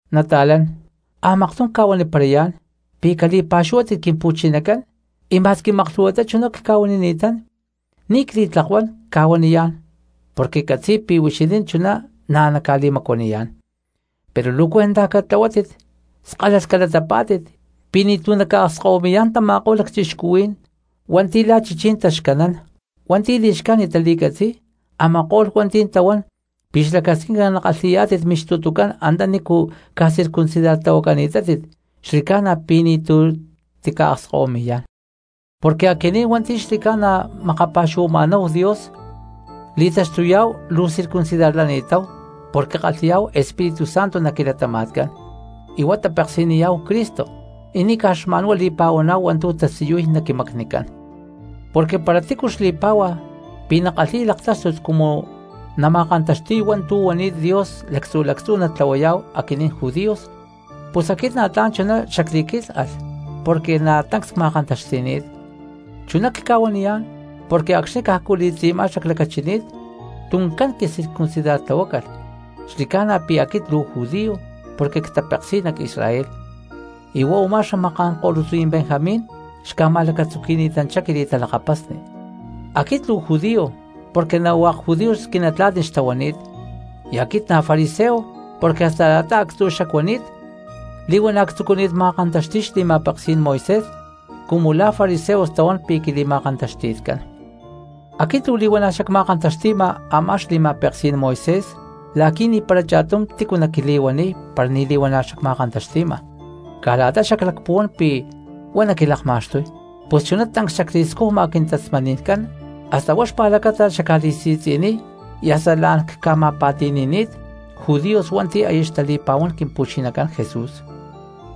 Nata̠lán, a̠maktum cca̠huaniparayá̠n pi̠ cali̠pa̠xuhuátit Quimpu̠chinacán, y ma̠squi maklhu̠huatá chuná cca̠huanini̠tán ni̠ cli̠tlakuán cca̠huaniyá̠n porque ccatzi̠y pi̠ huixinín chuná na̠ ca̠li̠macuaniyá̠n. Pero luu cuentaj catlahuátit skalalh calatapá̠tit pi̠ ni̠tu̠ naca̠akskahuimi̠yá̠n tama̠ko̠lh lacchixcuhuí̠n hua̠nti̠ lá chichí̠n taxcanán, hua̠nti̠ li̠xcájnit tali̠catzi̠y, a̠ma̠ko̠lh hua̠nti̠ tahuán pi̠ xlacasquinca nakalhi̠yá̠tit mixtutucán antanícu ca̠circuncidartlahuacani̠tátit; xli̠ca̠na pi̠ ni̠tu̠ tica̠akskahuimi̠yá̠n. Porque aquinín hua̠nti̠ xli̠ca̠na makapa̠xuhuama̠náhu Dios li̠taxtuyá̠hu luu circuncidarlani̠táhu porque kalhi̠yá̠hu Espíritu Santo nac quilatama̠tcán, y huá tapeksi̠niyá̠hu Cristo, y ni̠ caj xma̠nhuá li̠pa̠huaná̠hu hua̠ntu̠ tasiyuy nac quimacnicán. Porque para tícu xli̠pá̠hua pi̠ nakalhi̠y laktáxtut cumu nama̠kantaxti̠y hua̠ntu̠ huani̠t Dios lactzu̠ lactzú natlahuayá̠hu aquinín judíos, pus aquit na̠ tla̠n chuná xacli̠quílhalh porque na̠ tancs cma̠kantaxti̠ni̠t. Chuná cca̠huaniyá̠n porque acxni̠ cajcu li̠tzi̠má xaclacachini̠t tuncán quicircuncidartlahuácalh, xli̠ca̠na pi̠ aquit luu judío porque ctapeksi̠y nac Israel, y huá a̠má xamaká̠n ko̠lutzí̠n Benjamín xca̠ma̠lacatzuqui̠ni̠tanchá quili̠talakapasni; aquit luu judío porque na̠ hua̠k judíos quinatla̠tni xtahuani̠t, y aquit na̠ fariseo porque hasta la̠ta actzu̠cú xacuani̠t li̠huana̠ ctzucuni̠t ma̠kantaxti̠y xli̠ma̠peksí̠n Moisés cumu la̠ fariseos tahuán pi̠ quili̠ma̠kantaxti̠tcán. Aquit luu li̠huana̠ xacma̠kantaxti̠ma a̠má xli̠ma̠peksí̠n Moisés la̠qui̠ ni̠para cha̠tum tícu naquili̠huaniy para ni̠ li̠huana̠ xacma̠kantaxti̠ma caj la̠ta xaclacpuhuán pi̠ huá nacli̠laktaxtuy. Pus chuná tancs xacli̠scujma quintasmani̠ncán hasta huá xpa̠lacata xacca̠li̠si̠tzi̠niy y hasta la̠n cca̠tima̠pa̠ti̠nini̠t judíos hua̠nti̠ aya xtali̠pa̠huán Quimpu̠chinacán Jesús.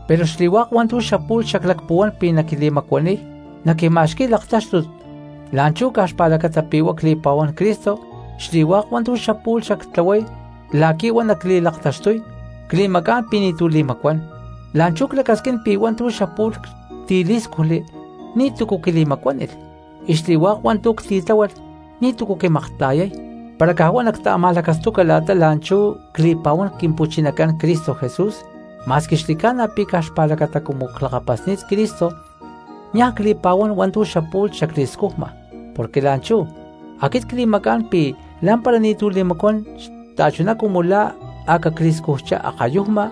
Pero xli̠hua̠k hua̠ntu̠ xapu̠lh xaclacpuhuán pi̠ naquili̠macuaniy naquima̠xqui̠y laktáxtut la̠nchú caj xpa̠lacata pi̠ huá cli̠pa̠huán Cristo xli̠hua̠k hua̠ntu̠ xapu̠lh xactlahuay la̠qui̠ huá nacli̠laktaxtuy cli̠macá̠n pi̠ ni̠tu̠cu li̠macuán. La̠nchú clacasquín pi̠ hua̠ntu̠ xapu̠lh ctilí̠scujli ni̠tu̠cu quili̠macuánilh, y xli̠hua̠k hua̠ntu̠ ctitláhualh ni̠tu̠cu quimakta̠yay para caj huá nacta̠ma̠lacastuca la̠ta la̠nchú cli̠pa̠huán Quimpu̠chinacán Cristo Jesús. Ma̠squi xli̠ca̠na pi̠ caj xpa̠lacata cumu clakapasni̠t Cristo niaj cli̠pa̠huán hua̠ntu̠ xapu̠lh xacli̠scujma, porque la̠nchú aquit cca̠li̠macá̠n pi̠ lá̠mpara ni̠tu̠ li̠macuán xta̠chuná cumu la̠ a̠ cacli̠scujchá akayujma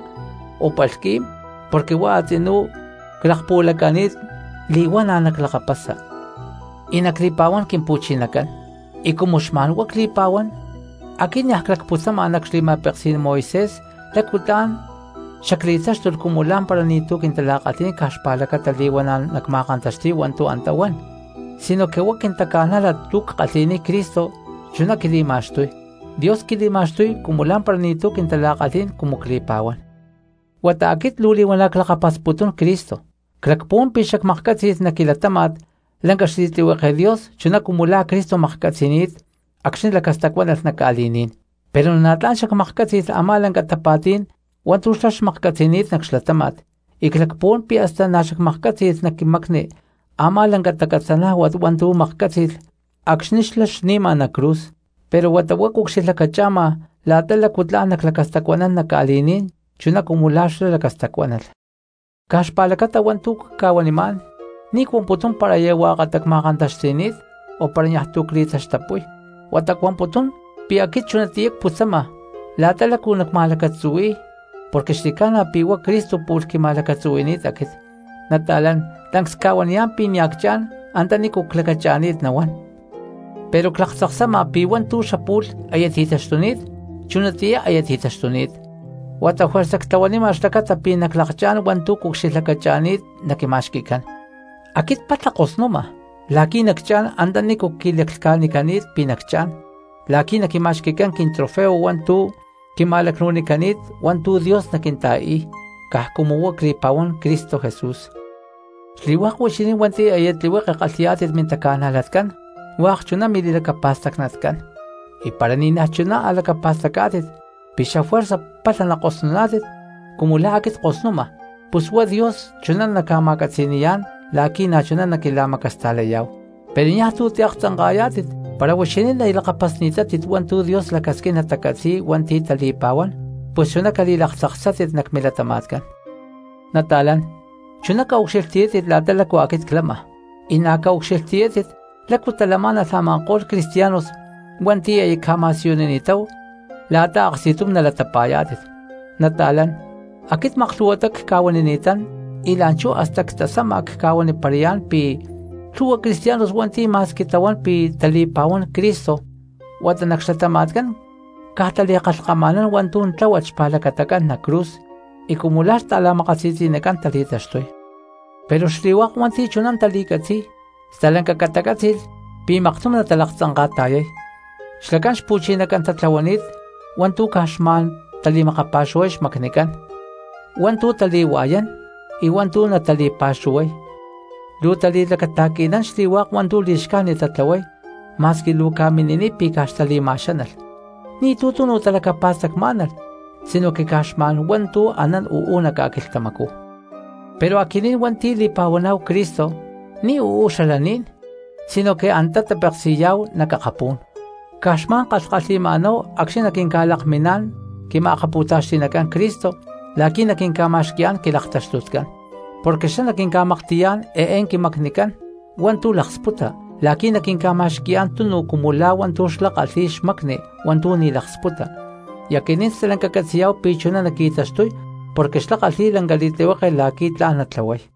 o palhqui̠m, porque huá a̠tzinú clakpuhualaca̠ni̠t li̠huana̠ naclakapasa y nacli̠pa̠huán Quimpu̠chinacán. Y cumu xma̠n huá cli̠pa̠huán, aquit niaj clacputzama nac xli̠ma̠peksí̠n Moisés lácu tla̠n xacli̠táxtulh cumu lá̠mpara ni̠tu̠ quintala̠kalhí̠n caj xpa̠lacata li̠huana̠ nacma̠kantaxti̠y hua̠ntu̠ antá huan, sinoque huá quintaca̠nájlat tu̠ ckalhi̠niy Cristo chuná quili̠ma̠xtuy. Dios quili̠ma̠xtuy cumu lá̠mpara ni̠tu̠ quintala̠kalhí̠n cumu cli̠pa̠huán. Huata aquit luu li̠huana̠ clakapasputún Cristo, clacpuhuán pi̠ xacmaklhcátzi̠lh nac quilatáma̠t lanca xli̠tlihueke Dios chuná cumu la̠ Cristo maklhcatzi̠ni̠t acxni̠ lacastacuánalh nac ca̠li̠ní̠n, pero na̠ tla̠n xacmaklhcátzi̠lh a̠má lanca tapa̠tí̠n hua̠ntu̠ xlá maklhcatzi̠ni̠t nac xlatáma̠t, y clacpuhuán pi̠ hasta na̠ xacmaklhcátzi̠lh nac quimacni a̠má lanca tacatzanájuat hua̠ntu̠ maklhcátzi̠lh acxni̠ xlá xni̠ma nac cruz. Pero huata huá cucxilhlacacha̠ma la̠ta lácu tla̠n naclacastacuanán nac ca̠li̠ní̠n chuná cumu la̠ xlá lacastacuánalh. Caj xpa̠lacata hua̠ntu̠ cca̠huanimá̠n ni̠ cuamputún para aya huakatá cma̠kantaxti̠ni̠t, o para niaj tu̠ cli̠taxtapúy, huata cuamputún pi̠ aquit chunatiyá cputzama la̠ta lácu tla̠n nacma̠lacatzuhui̠y, porque xli̠ca̠na pi̠ huá Cristo pu̠lh quima̠lacatzuhui̠ni̠t aquit. Nata̠lán, tancs cca̠huaniyá̠n pi̠ nia̠ ccha̠n antanícu clacacha̠ni̠t nawán, pero claktzaksama pi̠ hua̠ntu̠ xapu̠lh aya ti̠taxtuni̠t chunatiyá aya ti̠taxtuni̠t, huata juerza ctlahuanima xlacata pi̠ naclakchá̠n hua̠ntu̠ cucxilhlacacha̠ni̠t naquima̠xqui̠cán. Aquit palha ckosma la̠qui̠ nacchá̠n antanícu quilaclhca̠huili̠nicani̠t pi̠ nacchá̠n la̠qui̠ naquima̠xqui̠cán quintrofeo hua̠ntu̠ quima̠lacnu̠nicani̠t hua̠ntu̠ Dios naquinta̠i̠y caj cumu huá cli̠pa̠huán Cristo Jesús. Xli̠hua̠k huixinín hua̠nti̠ aya tlihueketá kalhi̠yá̠tit mintaca̠najlatcán hua̠k chuná mili̠lacapa̠stacnatcán. Y para ni̠naj chuná a̠ lacapa̠stacá̠tit pi̠ xafuerza palha nakosnuná̠tit cumu lá aquit ckosnuma pus huá Dios chuná naca̠ma̠catzi̠ni̠yá̠n la̠qui̠ na̠chuná naquila̠macasta̠layá̠hu. Pero niaj tu̠ tiaktzanka̠yá̠tit para huixinín aya lakapasni̠tátit hua̠ntu̠ Dios lacasquín natacatzi̠y hua̠nti̠ tali̠pa̠huán, pus chuná cali̠laktzaksátit nac milatama̠tcán. Nata̠lán, chuná caucxilhtiyátit la̠ta lácu aquit clama, y na̠ caucxilhtiyátit lácu talamá̠nalh a̠ma̠ko̠lh cristianos hua̠nti̠ aya cca̠ma̠siyunini̠táhu la̠ta aksti̠tum nalatapa̠yá̠tit. Nata̠lán, aquit maklhu̠huatá cca̠huanini̠tán y la̠nchú hasta ctasama cca̠huaniparayá̠n pi̠ lhu̠hua cristianos hua̠nti̠ ma̠squi tahuán pi̠ tali̠pa̠huán Cristo huata nac xlatama̠tcán caj tali̠kalhkama̠nán hua̠ntu̠ tláhualh xpa̠lacatacán nac cruz y cumu la̠ xta̠la̠makasi̠tzi̠ná tali̠taxtuy. Pero xli̠hua̠k hua̠nti̠ chuná tali̠catzi̠y stalanca catacátzi̠lh pi̠ maktum natalaktzanka̠ta̠yay. Xlacán xpu̠chinacán tatlahuani̠t hua̠ntu̠ caj xma̠n natali̠makapa̠xuhuay xmacnicán hua̠ntu̠ tali̠hua̠yán y hua̠ntu̠ natali̠pa̠xuhuay; luu tali̠lacata̠qui̠nán xli̠hua̠k hua̠ntu̠ li̠xcájnit tatlahuay ma̠squi luu ca̠mini̠niy pi̠ caj xtali̠lacama̠xánalh. Ni̠tu̠ tunu talacapa̠stacmá̠nalh sino caj xma̠n hua̠ntu̠ anán uú nac ca̠quilhtamacú. Pero aquinín hua̠nti̠ li̠pa̠huaná̠hu Cristo ni̠ uú xalaní̠n sinoque antá tapeksi̠yá̠hu nac akapú̠n, caj xma̠n kalhkalhi̠huila̠náhu acxni̠ naquinca̠lakminá̠n quima̠kapu̠taxti̠nacán Cristo la̠qui̠ naquinca̠ma̠xqui̠yá̠n quilaktaxtutcán. Porque xlá naquinca̠maklhti̠yá̠n eé quimacnicán hua̠ntu̠ laksputa la̠qui̠ naquinca̠ma̠xqui̠yá̠n tunu cumu la̠ hua̠ntu̠ xlá kalhi̠y xmacni hua̠ntu̠ ni̠ laksputa. Y aquinín stalanca catzi̠yá̠hu pi̠ chuná naqui̠taxtuy porque xlá kalhi̠y lanca li̠tlihueke la̠qui̠ tla̠n natlahuay.